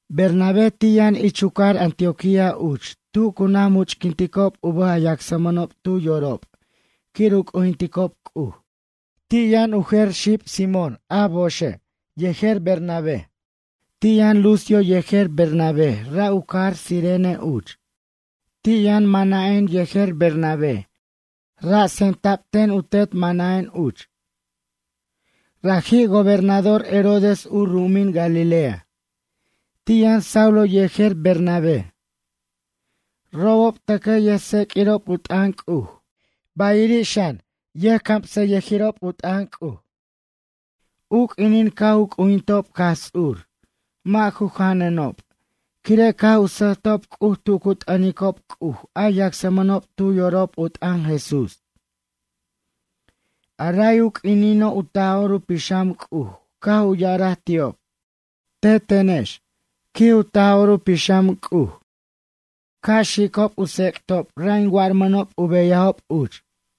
Bernabé ti' yʌn ich u cajar Antioquía uch tu cu naj much'quinticob u bʌj a yacsmʌnob tu yorob quir u c'ujinticob C'uj. Ti' yʌn u jer xib Simón a boxe' yejer Bernabe. Ti' yʌn Lucio yejer Bernabé, ra' u cajar Cirene uch. Ti' yʌn Manaén yejer Bernabé, ra' tsemta'b ten u tet Manaén uch. Raji' gobernador Herodes u ru'umin Galilea. Ti' yʌn Saulo yejer Bernabé. Robob tʌcʌj yʌjtseq'uirob u t'ʌn C'uj, bayiri' xan, yʌjcamsʌyʌjirirob u t'ʌn C'uj. U q'uinin caj u c'ujintob Jaj Ts'ur, mʌ' ju janʌnob, quire' caj u sʌjtob C'uj tu cu t'ʌnicob C'uj a yacsmʌnob tu yorob u t'ʌn Jesús. A ray u q'uinino', u Taj'or u Pixam C'uj caj u ya'araj ti'ob: ―Tetenex ―quij u Taj'or u Pixam C'uj―, ca' xicob u tsec'tob ra' in warmʌnob u beyajob uch.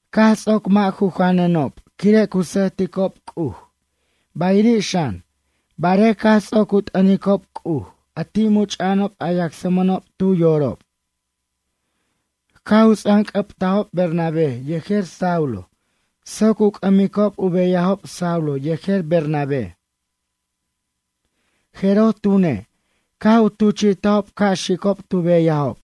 Caj ts'oc mʌ' ju janʌnob, quire' cu sʌjticob C'uj bayiri' xan, barej caj ts'oc u t'ʌnicob C'uj, a ti' much'a'anob a yacsmʌnob tu yorob, caj u ts'anc'ʌbtajob Bernabé yejer Saulo soc u c'ʌmicob u beyajob Saulo yejer Bernabé. Jeroj tune', caj u tuchi'tajob ca' xicob tu beyajob.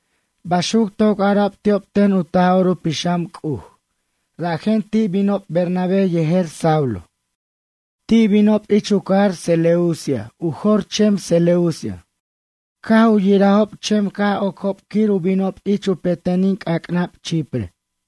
Baxuc toc ara'b ti'ob ten u Taj'or u Pixam C'uj, rajen ti' binob Bernabé yejer Saulo. Ti' binob ich u cajar Seleucia, u jor chem Seleucia. Caj u yirajob chem caj ocob quir u binob ich u petenin c'ac'nab Chipre.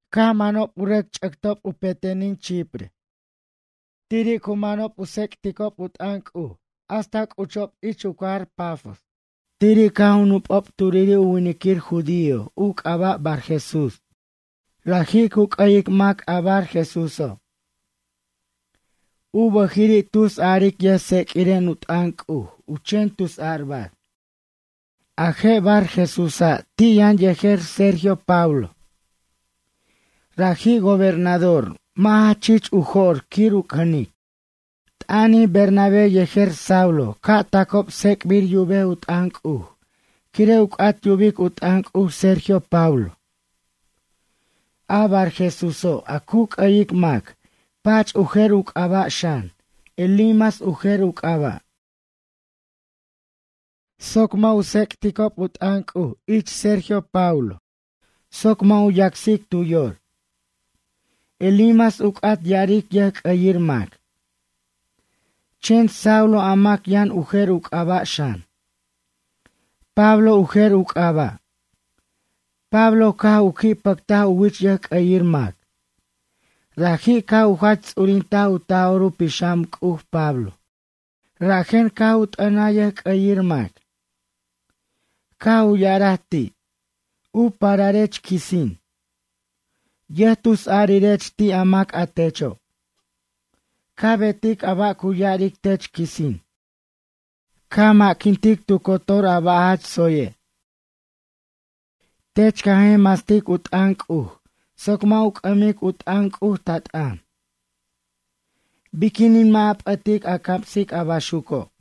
Caj manob u rʌc ch'ʌctob u petenin Chipre. Tiri' cu manob u tsec'ticob u t'ʌn C'uj hasta c'uchijob ich u cajar Pafos. Tiri' caj u nupob turiri' u winiquir judío, u c'aba' Barjesús. Raji' cu c'ʌyic mac, a Barjesúso'. U bʌjiri' tus a'aric yʌjtseq'uiren u t'ʌn C'uj, u chen tusarbar. A je' Barjesúsa', ti' yʌn yejer Sergio Paulo. Raji' gobernador, mʌ' jach chich u jo'r quir u cʌnic. T'ʌnij Bernabé yejer Saulo ca' tacob tsec'bir yubej u t'ʌn C'uj, quire' u c'at yubic u t'ʌn C'uj Sergio Paulo. A Barjesúso', a cu c'ʌyic mac, pach u jer u c'aba' xan, Elimas u jer u c'aba'. Raji' caj u ma'quintaj soc mʌ' u tsec'tob u t'ʌn C'uj ich Sergio Paulo soc mʌ' u yacsic tu yor. Elimas u c'at ya'aric yʌjc'ʌyir mac. Chen Saulo a mac yʌn u jer u c'aba' xan. Pablo u jer u c'aba'. Pablo caj u qui' pʌctaj u wich yʌjc'ʌyir mac. Raji' caj u jach ts'urintaj u Taj'or u Pixam C'uj, Pablo, rajen caj u t'ʌnaj yʌjc'ʌyir mac. Caj u ya'araj ti': ―U pararech quisin. Yʌjtusarirech ti' mac a techo'. Ca betic a ba' cu ya'aric tech quisin. Ca ma'quintic tu cotor a ba' jach tsoye'. Tech ca jer mastic u t'ʌn C'uj soc mʌ' u c'ʌmic u t'ʌn C'uj, ta t'ʌn. Biquinin mʌ' a p'ʌtic a camsic a baxuco'?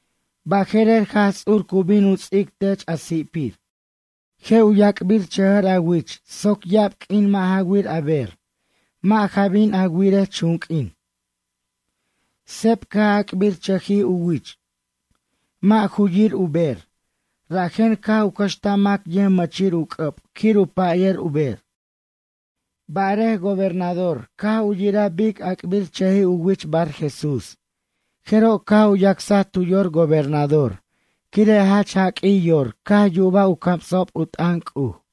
Baje'rer, Jaj Ts'ur cu bin u ts'ic tech a si'pir. Je' u yac'birchʌjʌr a wich soc ya'ab q'uin mʌ' ja wir a ber, mʌ' ja bin a wirej chunq'uin. Seb caj ac'birchʌjij u wich. Mʌ' ju yir u ber, rajen caj u cʌxtaj mac yʌjmʌchir u c'ʌb quir u payʌr u ber. Barej, gobernador caj u yiraj bic ac'birchʌjij u wich Barjesús, jeroj caj u yacsaj tu yor gobernador, quire' jach jaq'uij yor caj yubaj u camsa'ob u t'ʌn C'uj.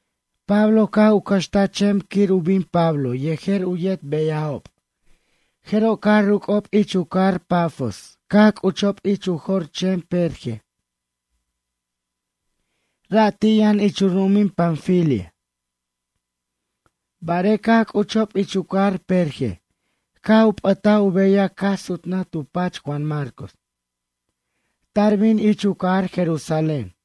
Pablo caj u cʌxtaj chem quir u bin Pablo yejer u yet beyajob, jeroj caj ruc'ob ich u cajar Pafos caj c'uchob ich u jor chem Perge. Ra' ti' yʌn ich u ru'umin Panfilia. Barej, caj c'uchob ich u cajar Perge, caj u p'ʌtaj u beyaj caj sutnʌj tu pach Juan Marcos. Tar bin ich u cajar Jerusalén.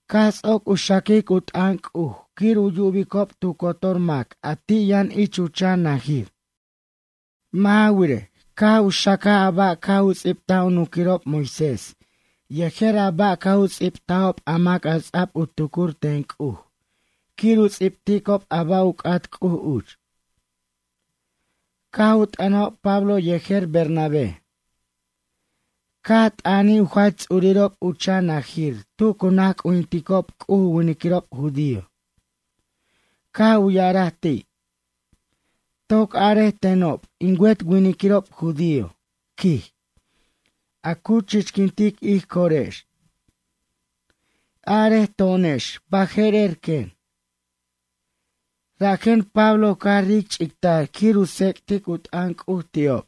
Caj ts'oc u xaquic u t'ʌn C'uj quir u yubicob tu cotor mac a ti' yʌn ich u chan najir. Mʌ' ja wirej, caj u xacaj a ba' caj u ts'ibtaj u nunquirob Moisés, yejer a ba' caj u ts'ibtajob a mac a ts'a'b u tucur ten C'uj quir u ts'ibticob a ba' u c'at C'uj uch. Caj u t'ʌnajob Pablo yejer Bernabé. Caj t'ʌnij u jach ts'urirob u chan najir tu cu naj c'ujinticob C'uj u winiquirob judío. Caj u ya'araj ti': ―Toc arej tenob, in wet winiquirob judío ―quij―, a cu chichquintic ij corex. Arej to'onex, baje'rer quen. Rajen Pablo caj ric' ch'ictar quir u tsec'tic u t'ʌn C'uj ti'ob.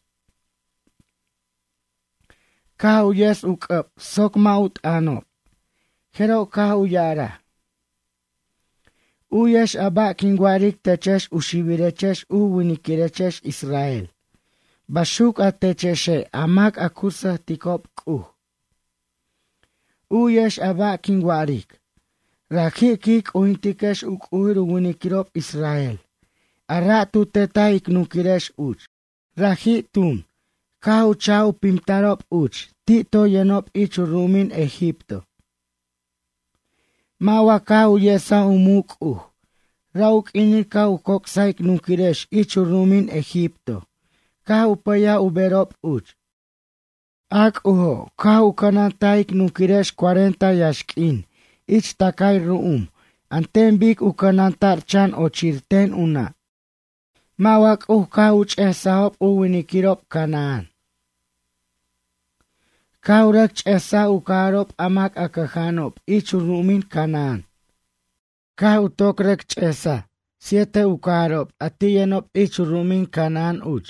Caj u yes u c'ʌb soc mʌ' u t'ʌnob, jeroj caj u ya'araj: ―U'yex a ba' quin wa'aric techex u xibirechex u winiquirechex israel, baxuc a techexe' a mac a cu sʌjticob C'uj. U'yex a ba' quin wa'aric. Raji' quij c'ujintiquex u c'ujir u winiquirob israel, a ra' tu tetaj ic nunquirex uch. Raji', tun, caj u cha'j u pimtarob uch ti' toy yʌnob ich u ru'umin Egipto. Mʌ' wa caj u yesaj u muc' C'uj, ra' u q'uinin caj u joc'saj ic nunquirex ich u ru'umin Egipto, caj u pʌyaj u berob uch. A C'ujo', caj u cʌnantaj ic nunquirex cuarenta yaxq'uin ich tacay ru'um an ten bic u cʌnanta'r chan ochir ten u nʌ'. Mʌ' wa C'uj caj u ch'esajo' u winiquirob canaán? Caj u rʌc ch'esaj u cajarob a mac a cʌja'anob ich u ru'umin Canaán. Caj u toc rʌc ch'esaj siete u cajarob a ti' yʌnob ich u ru'umin Canaán uch,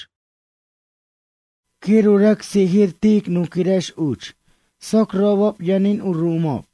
quir u rʌc sijir ti' ic nunquirex uch, soc robob yʌnin u ru'umob.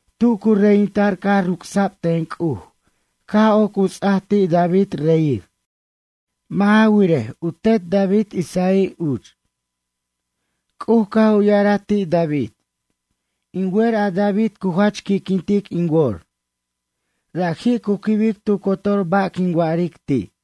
Tu cu reyinta'r caj ruc'sa'b ten C'uj, caj oc u ts'aj ti' David reyir. Mʌ' ja wirej, u tet David Isaí uch. C'uj caj u ya'araj ti' David: “In wer a David cu jach qui'quintic in wor. Raji' cu quibic tu cotor ba' quin wa'aric ti'.”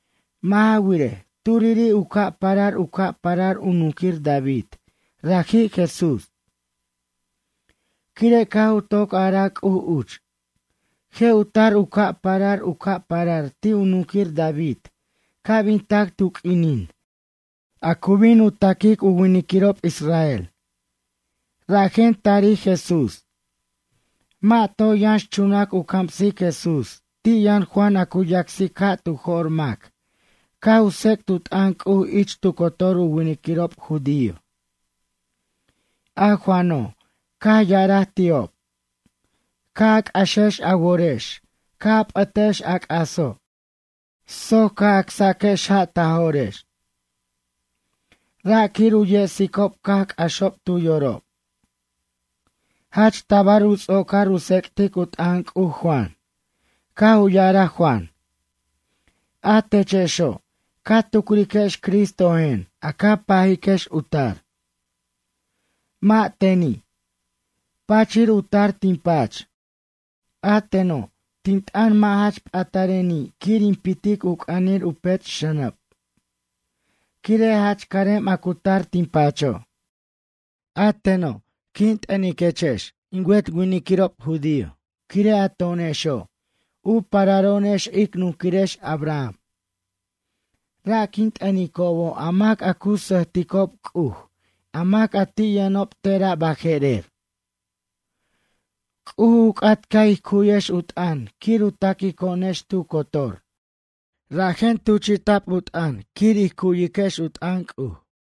Mʌ' ja wirej, turiri' u ca' parar u ca' parar u nunquir David, raji' Jesús. Quire' caj u toc araj C'uj uch: “Je' u tar u ca' parar u ca' parar ti' u nunquir David ca' bin tac tu q'uinin, a cu bin u taquic u winiquirob israel.” Rajen tarij Jesús. Mʌ' toy yʌnxchunac u camsic Jesús, ti' yʌn Juan a cu yacsic ja' tu jo'r mac, caj u tsec't u t'ʌn C'uj ich tu cotor u winiquirob judío. A Juano', caj ya'araj ti'ob: “Ca' a c'axex a worex, ca' a p'ʌtex a c'aso', soc ca' acsaquex ja' ta jo'rex.” Ra' quir u yesicob caj c'axob tu yorob. Jach tabar u ts'ocar u tsec'tic u t'ʌn C'uj Juan, caj u ya'araj Juan: “A techexo', ca tucriquex Cristojen, a ca pajiquex u tar. Mʌ' teni'. Pachir u tar tin pach. A teno', tin t'ʌn mʌ' jach patareni' quir in pitic u c'anir u pech' xʌnʌb. Quire' jach carem a cu tar tin pacho'.” A teno', quin t'ʌniquechex in wet winiquirob judío, quire' a to'onexo', u pararo'onex ic nunquirex Abraham. Ra' quin t'ʌnicobo' a mac a cu sʌjticob C'uj, a mac a ti' yʌnob tera' baje'rer. C'uj u c'at ca' ij cu'yex u t'ʌn quir u taquico'onex tu cotor, rajen tuchi'ta'b u t'ʌn quir ij cu'yex u t'ʌn C'uj.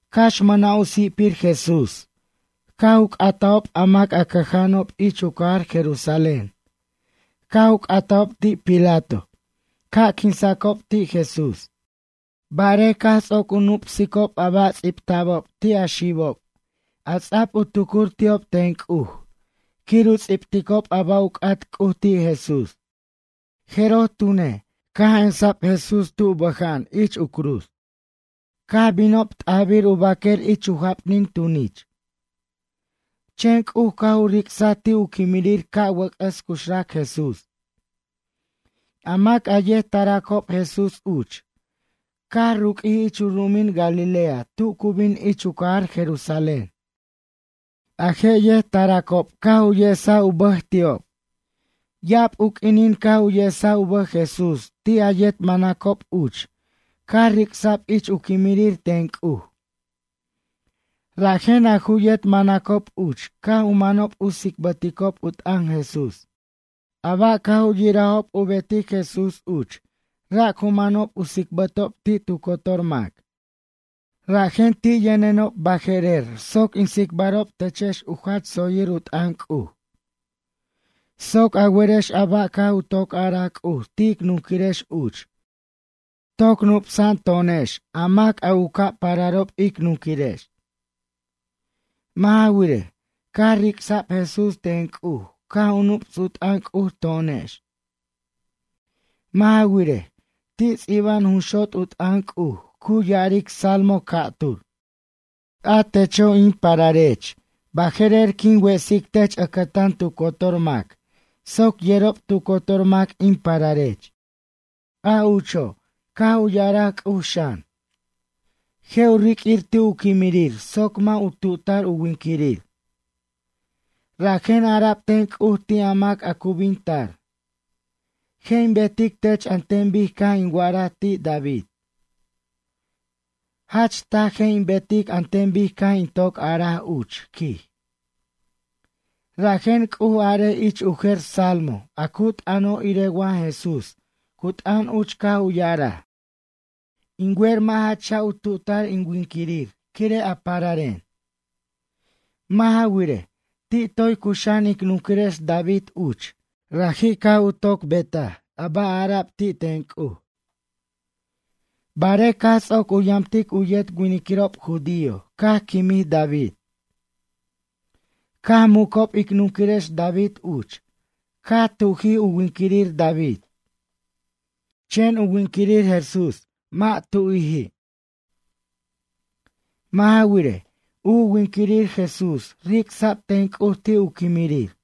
Cax mʌna' u si'pir Jesús, caj u c'atajob a mac a cʌja'anob ich u cajar Jerusalén, caj u c'atajob ti' Pilato ca' quinsacob ti' Jesús. Barej caj ts'oc u nup'sicob a ba' ts'ibta'bob ti' a xibob, a ts'a'b u tucur ti'ob ten C'uj, quir u ts'ibticob a ba' u c'at C'uj ti' Jesús. Jeroj tune', caj ensa'b Jesús tu bʌja'an ich u cruz, caj binob t'ajbir u baquer ich u japnin tunich. Chen C'uj caj u ric'saj ti' u quimirir ca' wʌc'ʌs cuxrac Jesús. A mac a yet taracob Jesús uch, caj ruq'uij ich u ru'umin Galilea tu cu bin ich u cajar Jerusalén. A je' yet taracob caj u yesaj u bʌj ti'ob. Ya'ab u q'uinin caj u yesaj u bʌj Jesús ti' a yet manacob uch caj ric'sa'b ich u quimirir ten C'uj. Rajen a ju yet manacob uch caj u manob u tsicbʌticob u t'ʌn Jesús. A ba' caj u yirajob u betic Jesús uch, ra' cu manob u tsicbʌtob ti' tu cotor mac. Rajen ti' yʌnenob baje'rer soc in tsicbarob techex u jach tsoyir u t'ʌn C'uj. Soc a werex a ba' caj u toc araj C'uj ti' ic nunquirex uch, toc nup'sa'an to'onex a mac a u ca' pararob ic nunquirex. Mʌ' ja wirej, caj ric'sa'b Jesús ten C'uj caj u nup's u t'ʌn C'uj to'onex. Mʌ' ja wirej, ti' ts'iba'an jun xot' u t'ʌn C'uj, cu ya'aric salmo ca'tur: “A techo', in pararech, baje'rer quin wesic tech ʌcʌtan tu cotor mac soc yerob tu cotor mac in pararech.” A ucho', caj u ya'araj C'uj xan: “Je' u riq'uir ti' u quimirir soc mʌ' u tu'tar u winiquirir.” Rajen ara'b ten C'uj ti' a mac a cu bin tar: “Je' in betic tech an ten bic caj in wa'araj ti' David. Jach taj je' in betic an ten bic caj in toc araj uch, quij.” Rajen C'uj arej ich u jer salmo a cu t'ʌno' irej wa Jesús cu t'ʌn uch caj u ya'araj: “In wer mʌ' ja cha' u tu'tar in winquirir quire' a pararen.” Mʌ' ja wirej, ti' toy cuxa'an ic nunquirex David uch, raji' caj u toc betaj a ba' ara'b ti' ten C'uj. Barej caj ts'oc u yamtic u yet winiquirob judío caj quimij David. Caj mucob ic nunquirex David uch, caj tu'jij u winquirir David. Chen u winquirir Jesús mʌ' tu'jiji'. Mʌ' ja wirej, u winquirir Jesús ric'sa'b ten C'uj ti' u quimirir.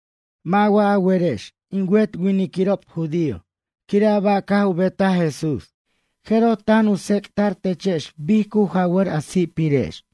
Mʌ' wa a werex, in wet winiquirob judío quire' a ba' caj u betaj Jesús, jeroj, tan u tsec'ta'r techex bic cu jawʌr a si'pirex.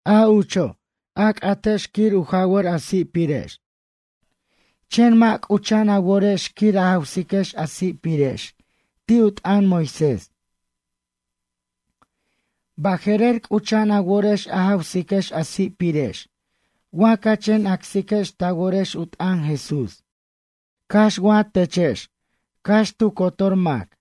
A ucho', a c'atex quir u jawʌr a si'pirex, chen mʌ' c'ucha'an a worex quir a jawsiquex a si'pirex ti' u t'ʌn Moisés. Baje'rer, c'ucha'an a worex a jawsiquex a si'pirex wa ca chen acsiquex ta worex u t'ʌn Jesús. Cax wa techex cax tu cotor mac.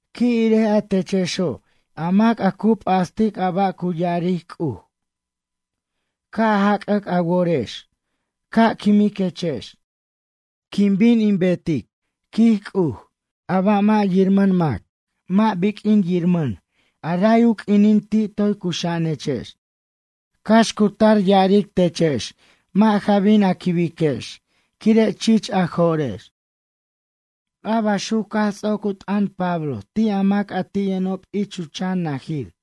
Qui' irej a techexo' a mac a cu p'astic a ba' cu ya'aric C'uj. Ca' jacac a worex. Ca' quimiquechex. Quin bin betic, quij C'uj, a ba' mʌ' yirmʌn mac mʌ' biq'uin yirmʌn a ray u q'uinin ti toy cuxa'anechex. Cax cu tar ya'aric techex mʌ' ja bin a quibiquex, quire' chich a jo'rex. A baxuc caj ts'oc u t'ʌn Pablo ti' a mac a ti' yʌnob ich u chan najir.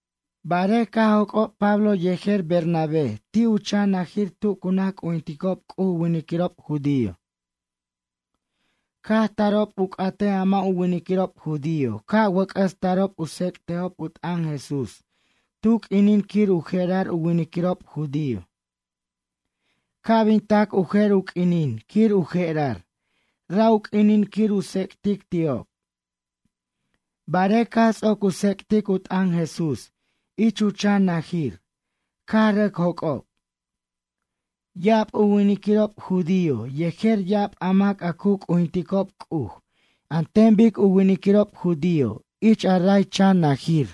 Barej caj joc'ob Pablo yejer Bernabé ti' u chan najir tu cu naj c'ujinticob C'uj u winiquirob judío. Caj tarob u c'atej a mʌ' u winiquirob judío ca' wʌc'ʌs tarob u tsec'tejob u t'ʌn Jesús tu q'uinin quir u je'rar u winiquirob judío. Ca' bin tac u jer u q'uinin quir u je'rar, ra' u q'uinin quir u tsec'tic ti'ob. Barej caj ts'oc u tsec'tic u t'ʌn Jesús ich u chan najir, caj rʌc joc'ob. Ya'ab u winiquirob judío, yejer ya'ab a mac a cu c'ujinticob C'uj an ten bic u winiquirob judío, ich a ray chan najir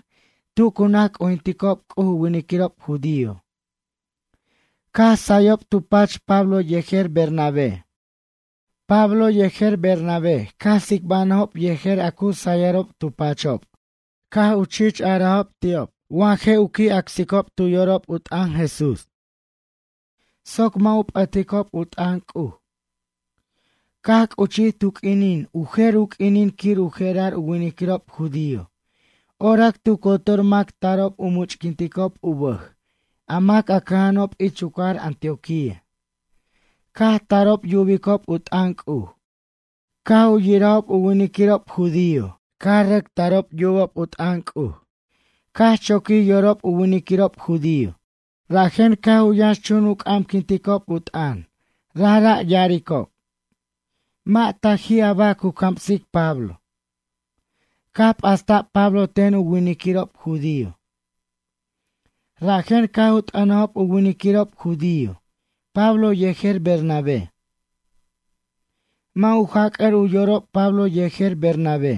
tu cu naj c'ujinticob C'uj u winiquirob judío, caj sayob tu pach Pablo yejer Bernabé. Pablo yejer Bernabé caj tsicbanʌjob yejer a cu sayʌrob tu pachob, caj u chich arajob ti'ob wa ju qui' acsiquicob tu yorob u t'ʌn Jesús, soc mʌ' u p'ʌticob u t'ʌn C'uj. Caj c'uchij tu q'uinin, u jer u q'uinin quir u je'rar u winiquirob judío, orac tu cotor mac tarob u much'quinticob u bʌj a mac a cʌja'anob ich u cajar Antioquía, caj tarob yubicob u t'ʌn C'uj. Caj u yirajob u winiquirob judío caj u rʌc tarob yubob u t'ʌn C'uj, caj choquij yorob u winiquirob judío. Rajen caj u yʌnxchun u c'amquinticob u t'ʌn, rajra' yaricob: ―Mʌ' taji' a ba' cu camsic Pablo. Caj p'asta'b Pablo ten u winiquirob judío. Rajen caj u t'ʌnajob u winiquirob judío, Pablo yejer Bernabé. Mʌ' u jac'ar u yorob Pablo yejer Bernabé.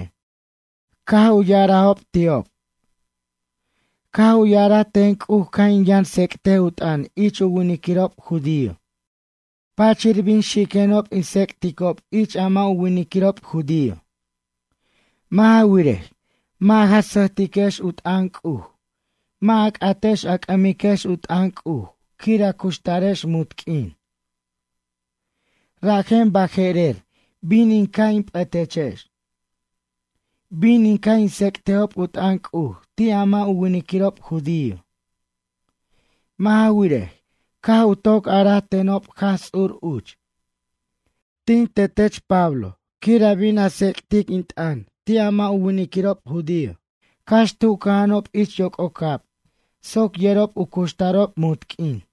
Caj u ya'arajob ti'ob: ―Caj u ya'araj ten C'uj ca' in yʌn tsec'tej u t'ʌn ich u winiquirob judío. Pachir bin xiquenob in tsec'ticob ich a mʌ' u winiquirob judío. Mʌ' ja wirej, mʌ' ja sʌjtiquex u t'ʌn C'uj, mʌ' a c'atex a c'ʌmiquex u t'ʌn C'uj quir a cuxtarex munt q'uin. Rajen, baje'rer bin in ca' in p'ʌtechex. Bin in ca' in tsec'tejob u t'ʌn C'uj ti' a mʌ' u winiquirob judío. Mʌ' ja wirej, caj u toc araj tenob Jaj Ts'ur uch: Tin tetech Pablo quir a bin a tsec'tic in t'ʌn ti' a mʌ' u winiquirob judío cax tu cʌja'anob ich yoc'ocab soc yerob u cuxtarob munt q'uin.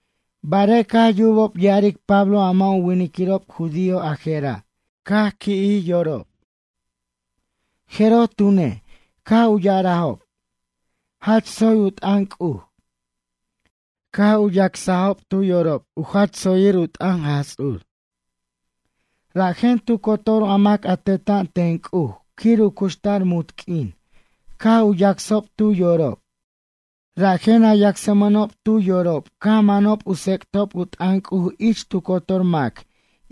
Barej caj yubob ya'aric Pablo a mʌ' u winiquirob judío ajera', caj qui'jij yorob. Jeroj tune', caj u ya'arajob: ―Jach tsoy u t'ʌn C'uj. Caj u yacsajob tu yorob u jach tsoyir u t'ʌn Jaj Ts'ur. Rajen tu cotor a mac a teta'an ten C'uj quir u cuxtar munt q'uin caj u yacsob tu yorob. Rajen a yacsmʌnob tu yorob caj manob u tsec'tob u t'ʌn C'uj ich tu cotor mac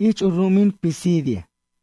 ich u ru'umin Pisidia.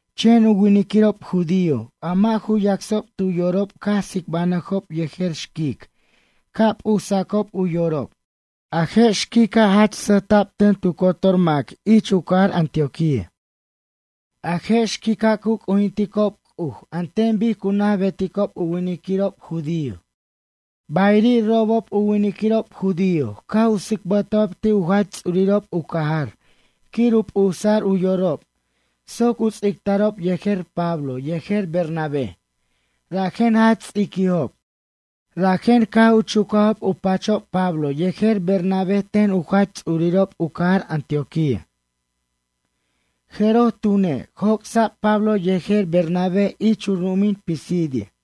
Chen u winiquirob judío a mʌ' ju yacsob tu yorob caj tsicbanʌjob yejer xquic ca' p'usacob u yorob. A je' xquica', jach sʌjta'b ten tu cotor mac ich u cajar Antioquía. A je' xquica', cu c'ujinticob C'uj an ten bic cu naj beticob u winiquirob judío. Bayiri' robob u winiquirob judío caj u tsicbʌtajob ti' u jach ts'urirob u cajar quir u p'usa'r u yorob soc u ts'ictarob yejer Pablo yejer Bernabé, rajen jach ts'iquijob, rajen caj u chucajob u pachob Pablo yejer Bernabé ten u jach ts'urirob u cajar Antioquía. Jeroj tune', joc'sa'b Pablo yejer Bernabé ich u ru'umin Pisidia.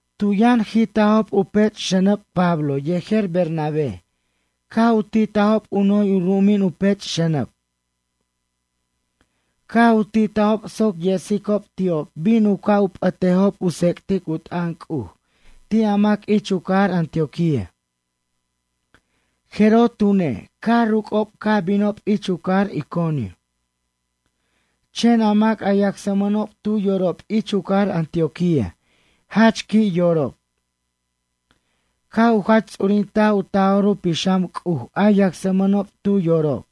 Tu yʌn jitajob u pech' xʌnʌb Pablo yejer Bernabe, caj u titajob u noy u ru'umin u pech' xʌnʌb. Caj u titajob soc yesicob ti'ob bin u ca' p'ʌtejob u tsec'tic u t'ʌn C'uj ti' a mac ich u cajar Antioquía. Jeroj tune', caj ruc'ob caj binob ich u cajar Iconio. Chen a mac a yacsmʌnob tu yorob ich u cajar Antioquía jach qui' yorob. Caj u jach ts'urintaj u Taj'or u Pixam C'uj a yacsmʌnob tu yorob.